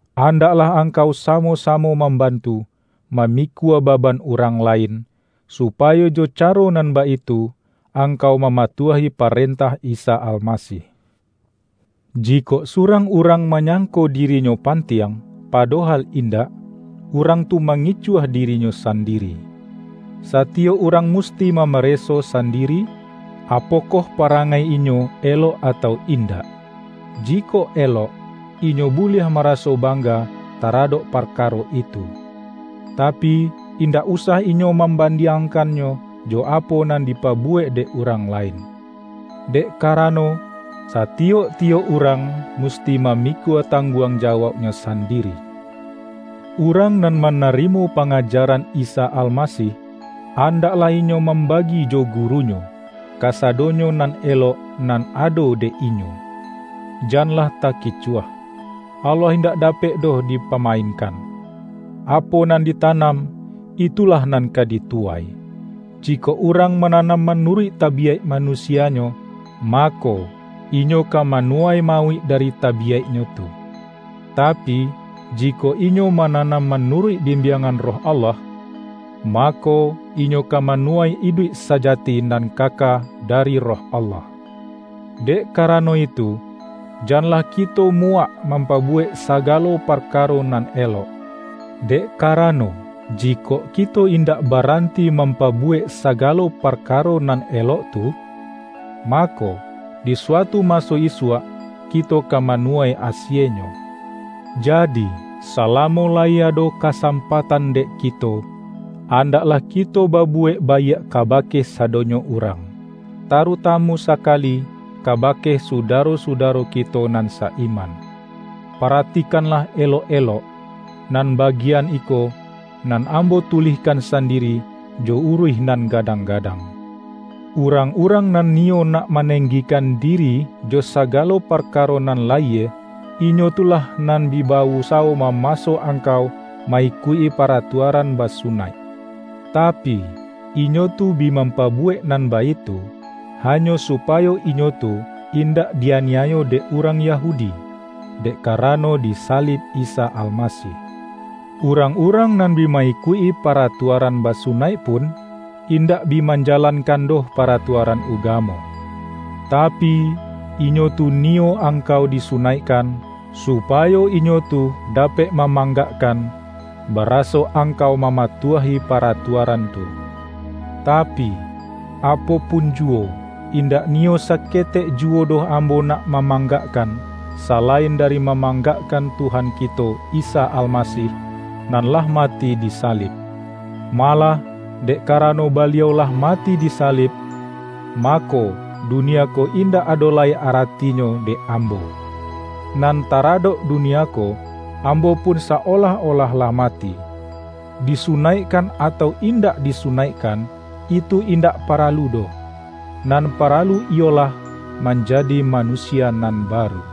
Andaklah angkau sa-mo-samo mambantu, mamikua baban urang lain, supayo jo caro nan baitu, angkau mamatuahi parentah Isa Alma-sih. Jikok surang urang manyangko dirinyo pantiang, padohal indak, urang tu mangicuah dirinyo sandiri. Satiyok urang musti mamareso sandiri, apo-koh parangai inyo elok atau indak. Ji-kok elok, inyo buliah maraso bangga taradok parkaro itu. Tapi, indak usah inyo mambandiangkannyo jo apo nan dipabuwek dek urang lain. Dek kara-no, satiyok-tiyok urang musti mamikua tangguang jawauknyo sandiri. Urang nan manarimo pangajaran Isa Almasih, andaklah inyo mambagi jo gurunyo, kasadonyo nan elok nan ado dek inyo. Janlah takicuah. Allah indak da-pek doh dipamainkan! Apo nan dita-nam, itulah nan ka dituwai. Jikok urang mananam manuruik tabiyaik manusianyo, mako, inyo ka manuwai mauik dari tabiyaiknyo tu. Tapi, jikok inyo mananam manuruik bimbiang-an Roh Allah, mako, inyo ka manuwai iduik sajati nan kaka dari Roh Allah. Dek karano itu, janlah kito muwak mampabuwek sagalo parkaro nan elok; dek karano, jikok kito indak baranti mampabuwek sagalo parkaro nan elok tu, mako, di suatu maso isuak kito ka manuwai asienyo. Jadi, salamo la-yi ado kasampatan dek kito, andaklah kito babuwek baiak kabake sadonyo urang, tarutamu sakali kabake suda-ro-sudaro kito nan sa-iman. Paratikanlah elok-elok, nan bagi-an iko, nan ambo tulihkan sandiri jo uruih nan gadang-gadang. Urang-urang nan niyo nak manenggikan di-ri jo sagalo parkaro nan layie, inyo tu lah nan bi ba-usawo mamaso angkau ma-ikuik-i paratuaran basunaik. Ta-pi, inyo tu bi mampabuwek nan baitu, hanyo supayo inyo tu indak di-aniayo dek urang Yahudi, dek karano di sa-lib Isa Almasih. Urang-urang nan bi ma-ikuik-i paratuaran basunaik pun, indak bi manjalankan doh paratua-ran ugamo. Tapi, inyo tu niyo ang-kau disunaikkan, supayo inyo tu da-pek mamanggakkan, baraso angkau mamatuahi paratuaran tu. Tapi, apo pun juwo, indak niyo saketek juwo doh ambo nak mamanggakkan, sa-lain dari mamanggakkan Tuhan kito Isa Almasih, nan lah mati disalib. Ma-lah, dek karano Baliau lah mati disa-lib, mako, dunia ko indak ado lai ara-tinyo dek ambo. Nan taradok dunia ko, ambo pun sa-olah-olah lah mati. Disunaikkan atau indak disunaik-kan, itu indak paralu doh. Nan para-lu iyolah manjadi manusia nan baru.